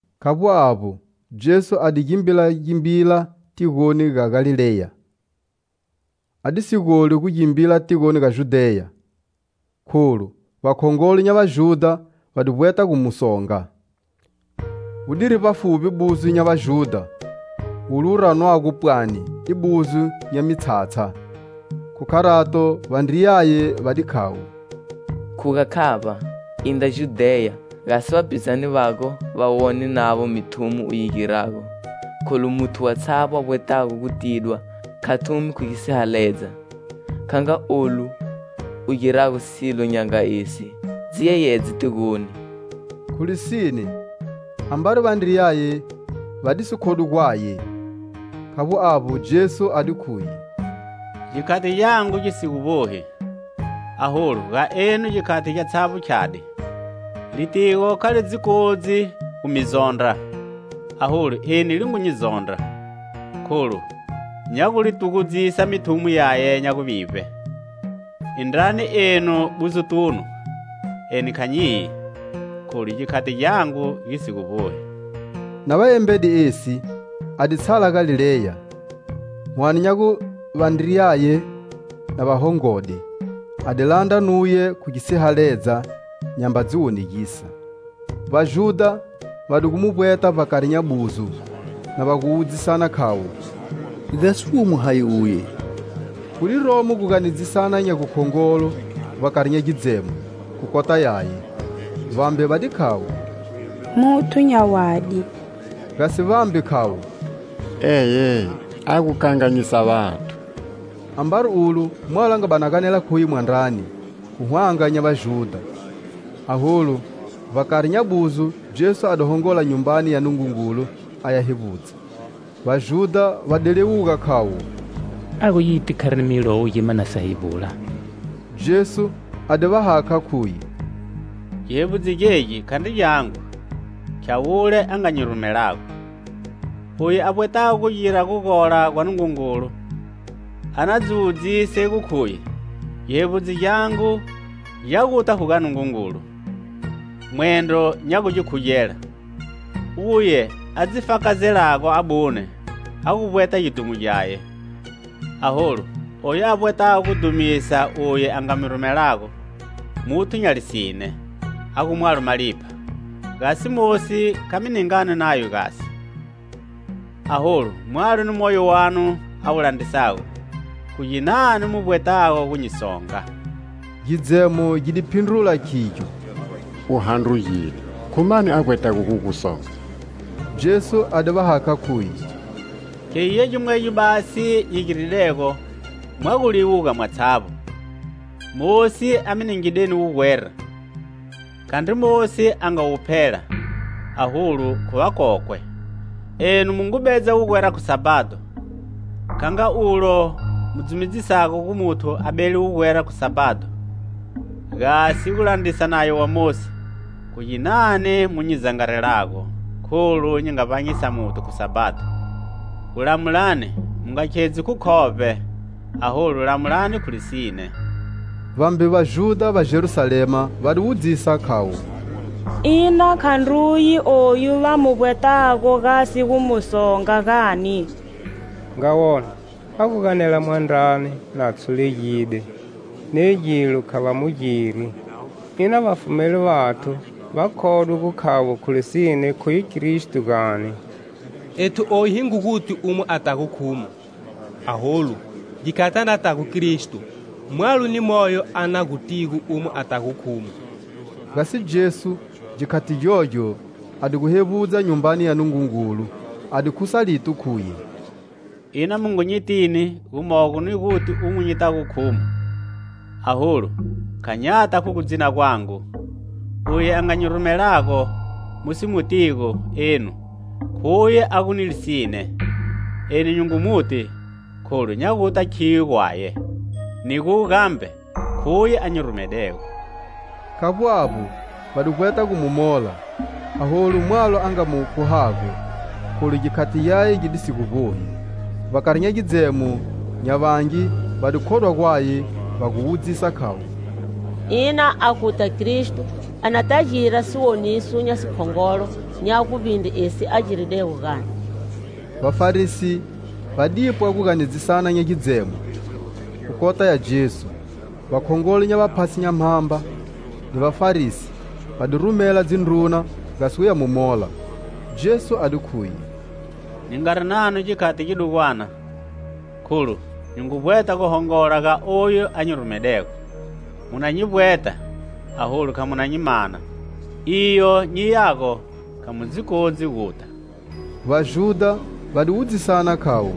Khavbo avbo, Jesu a di gimbilagimbila tigoni ga Galileya. Adisi goli gu gimbila tigoni ga Judheya, kholu vakhongolo nya Vajudha va di gu vbweta gu mu songa. Wudiri vbafuvbi buzo nya Vajudha, wule wu ranwago pwani i buzo nya mitshatsha. Khu kharato, vandriyaye va di khavo: "Khuga khavba, indra Judheya, gasi vapizane vago va wone navo mithumo u yi girago, kholu muthu watshavbo a vbwetago gu tidwa kha thumi khu gisihaledza. Kha nga olu u girago silo nya nga esi, dzi yeyedze tigoni." Khu lisine, ambari vandriyaye va disi khodwi gwaye. Khavbo avbo, Jesu a di khuye: "Gikhati gyangu gisi gu vbohi, aholu ga enu gikhati gyatshavbo khyadi. Litigo kha li dzi kodzi gu mi zondra, aholu eni li ngu nyi zondra, kholu nya gu li tugudzisa mithumo yaye nya guvivbe. Indrani enu buzotunu. Eni kha nyiyi, kholu gikhati gyangu gisi gu vbohi." Na va embede esi, a di tshala Galileya. Whane nya gu vandriyaye na va hongode, a di landra nuye khu gisihaledza, nyamba dzi wonegisa. Vajudha va di gu mu vbweta vbakari nya buzo, na va gu wudzisana, khayo: "Gasi womo hayi uye?" Gu di romo guganedzisana nya gukhongolo vbakari nya gidzemo khu kota yaye. Vambe va di khavo: "Muthu nya wadi," gasi vambe, khavo: "Eye! A gu kanganyisa vathu." Ambari ulo, mwalo a nga bani a ganela khuye mwandrani, khu hwanga nya Vajudha. Aholu vbakari nya buzo, Jesu a di hongola Nyumbani ya Nungungulu aya hevbudza. Vajudha va di liwuga khayo: "A gu yiti kharini Milowo gima na sa hevbula?" Jesu a di va hakha, khuye: "Gihevbudzo gegi khandri gyangu, khya wule a nga nyi rumelago. Uye a vbwetago gugira gugola gwa Nungungulu a na dzi wudzise gu khuye gihevbudzo gyangu gya guta khu ga Nungungulu, mwendro nya gu gi khugela. Uye a dzi fakazelago abune a gu vbweta gidhumo gyaye, aholu oyu a vbwetago gu dhumisa uye a nga mu rumelago, muthu nya lisine, a gu mwalo malipha. Gasi Mosi kha mi ningani nayo, gasi? Aholu mwalo ni moyo wanu a wu landrisago! Khu ginani mu vbwetago gu nyi songa?" Gidzemo gi di phindrula, khigyo: "U handrugide. Khu mani a vbwetago gu gu songa?" Jesu a di va hakha, khuye: "Khegi gya gimwegyo basi nyi giridego, mwa gu liwuga mwatshavbo. Mosi a mi ningideni wugwera - khandri Mosi a nga wu phela, aholu khu vakokwe - enu mu ngu bedza wugwera khu Sabhado. Kha nga olu mu dzumedzisago gu muthu a bele wugwera khu Sabhado, gasi gulandrisa Nayo wa Mosi, khu ginani mu nyi zangarelago kholu nyi nga vbanyisa muthu khu Sabhado? Gulamulani mu nga khedzi khu khovbe, aholu lamulani khu lisine." Vambe Vajudha va Jerusalema va di wudzisa, khayo: "Ina khandruye oyu va mu vbwetago gasi gu mu songa, gani? Nga wona, a gu ganela mwandrani, na tshulegide, ne gilo kha va mu giri! Ina vafumeli vathu va khodwe gu khavo khu lisine khuye Kristo, gani? Ethu oyu hi ngu guti umo atago khumo; aholu, gikhati anatago Kristo, mwalo ni moyo a na gutigo umo atago khumo." Gasi Jesu, gikhati gyogyo, a di gu hevbudza Nyumbani ya Nungungulu, a di khusa lito, khuye: "Ina, mu ngu nyitini gumogo ni guti umo nyitago khumo! Aholu kha nyata khu gudzina gwangu; uye a nga nyi rumelago, mu si mutigo enu khuye a gu ni lisine. Eni nyi ngu muti, kholu nya guta khiyo gwaye, ni gu gambe khuye a nyi rumedego." Khavbo avbo, va di vbweta gu mu mola, aholu mwalo a nga mu khuhago, kholu gikhati gyaye gi di si gu vbohi. Vbakari nya gidzemo, nya vangi va di khodwa gwaye, va gu wudzisa khavo: "Ina aguta Kristo anata gira siwoniso nya sikhongolo nya guvbindre esi a giridego, gani?" Vafarisi va dipwa guganedzisana nya gidzemo khu kota ya Jesu; vakhongolo nya vaphasi nya mhamba ni Vafarisi va di rumela dzindruna gasi guya mu mola. Jesu a di khuye: "Nyi ngari nanu gikhati gidugwana, kholu nyi ngu vbweta gu hongola ga oyu a nyi rumedego. Mu na nyi vbweta, aholu kha mu na nyi mana; iyo nyiyago kha mu dzi kodzi guta." Vajudha va di wudzisana, khavo: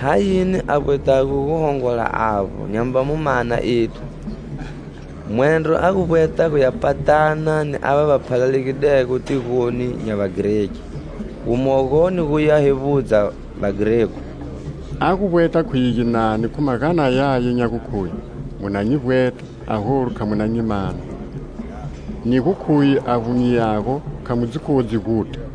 "Hayini a vbwetago guhongola avbo nyamba mu mana ethu? Mwendro a gu vbweta guya patana ni ava va phalalegidego tigoni nya Vagreki, gumogo ni guya hevbudza Vagregu? A gu vbweta khuye ginani khu magana yaya nya gukhuye: 'Muna nyi vbweta, aholu kha mu na nyi mana; ni gu khuye avbo nyiyago kha mu dzi kodzi guta?' "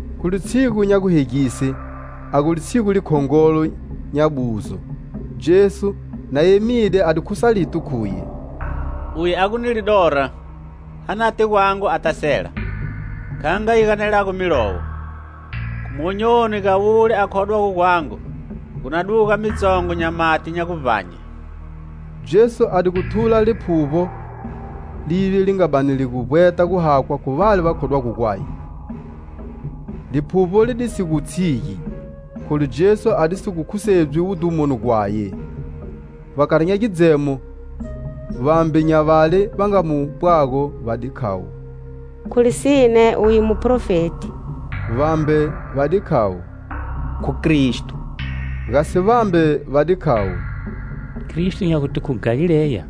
Khu litshigu nya guhegise, a gu litshigu likhongolo nya buzo, Jesu, na emide, a di khusa lito khuye: "Uye a gu ni lidora anate gwangu ata sela! Kha nga yi ganelago Milowo: khu monyoni ga wule a khodwago gwangu, gu na duga mitsongo nya mati nya guvbanye." Jesu a di gu thula Liphuvbo, lile li nga bani li vbweta guhakhwa khu vale va khodwago gwaye; Liphuvbo li di si gu tshigi, kholu Jesu adisi gu khusedzwi wudhumoni gwaye. Vbakari nya gidzemo, vambe nya vale va nga mu pwago, va di khavo: "Khu lisine uye muprofeti!" Vambe va di khavo: "Khu Kristo!" Gasi vambe va di khavo: "Kristo nya gute khu Galileya?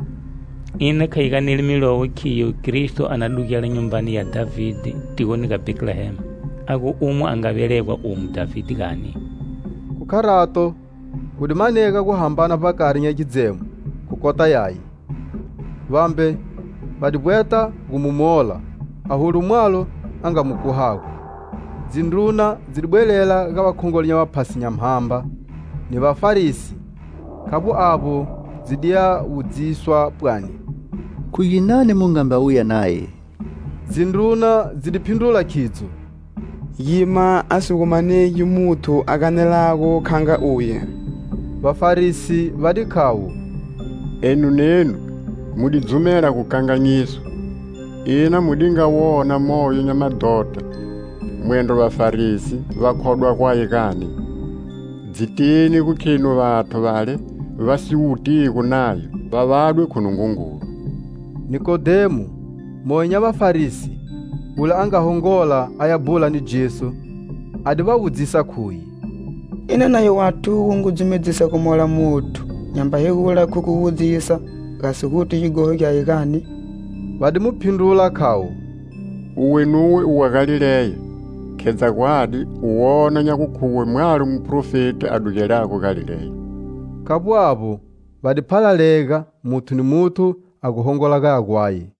Ina kha yi ganeli Milowo khiyo Kristo a na dugela nyumbani ya Dhavide, tigoni ga Bhetlehema, a gu umo a nga velegedwa umo Dhavide, gani?" Khu kharato, gu di manega gu hambana vbakari nya gidzemo khu kota Yaye. Vambe va di vbweta gu mu mola, aholu mwalo a nga mu khuhago. Dzindruna dzi di bwelela ga vakhongolo nya vaphasi nya mhamba ni Vafarisi; khavbo avbo, dzi diya wudziswa pwani: "Khu ginani mu ngamba wuya naye?" Dzindruna dzi di phindrula, khidzo: "Gima a si gu manegi muthu a ganelago kha nga uye!" Vafarisi va di khavo: "Enu nenu mu di dzumela gukanganyiswa? Ina, mu di nga wona moyo nya madhota mwendro Vafarisi va khodwa gwaye, gani? Dzitini gu khenu vathu vale va si wutigo Nayo va vadwe khu Nungungulu." Nikodemo, moyo nya Vafarisi, wule a nga hongola aya bhula ni Jesu, a di va wudzisa, khuye: "Ina nayo wathu wu ngu dumedzisa gumola muthu nyamba hegula khu gu mu wudzisa, gasi guti gighoho gyaye, gani?" Va di mu phindrula, khavo: "Uwe nuwe u wa Galileya? Khedza gwadi, u na wona nya gukhuwe mwalo muprofeti a dugelago Galileya." [ Khavbo avbo, va di phalalega: muthu ni muthu a gu hongola gaya gwaye.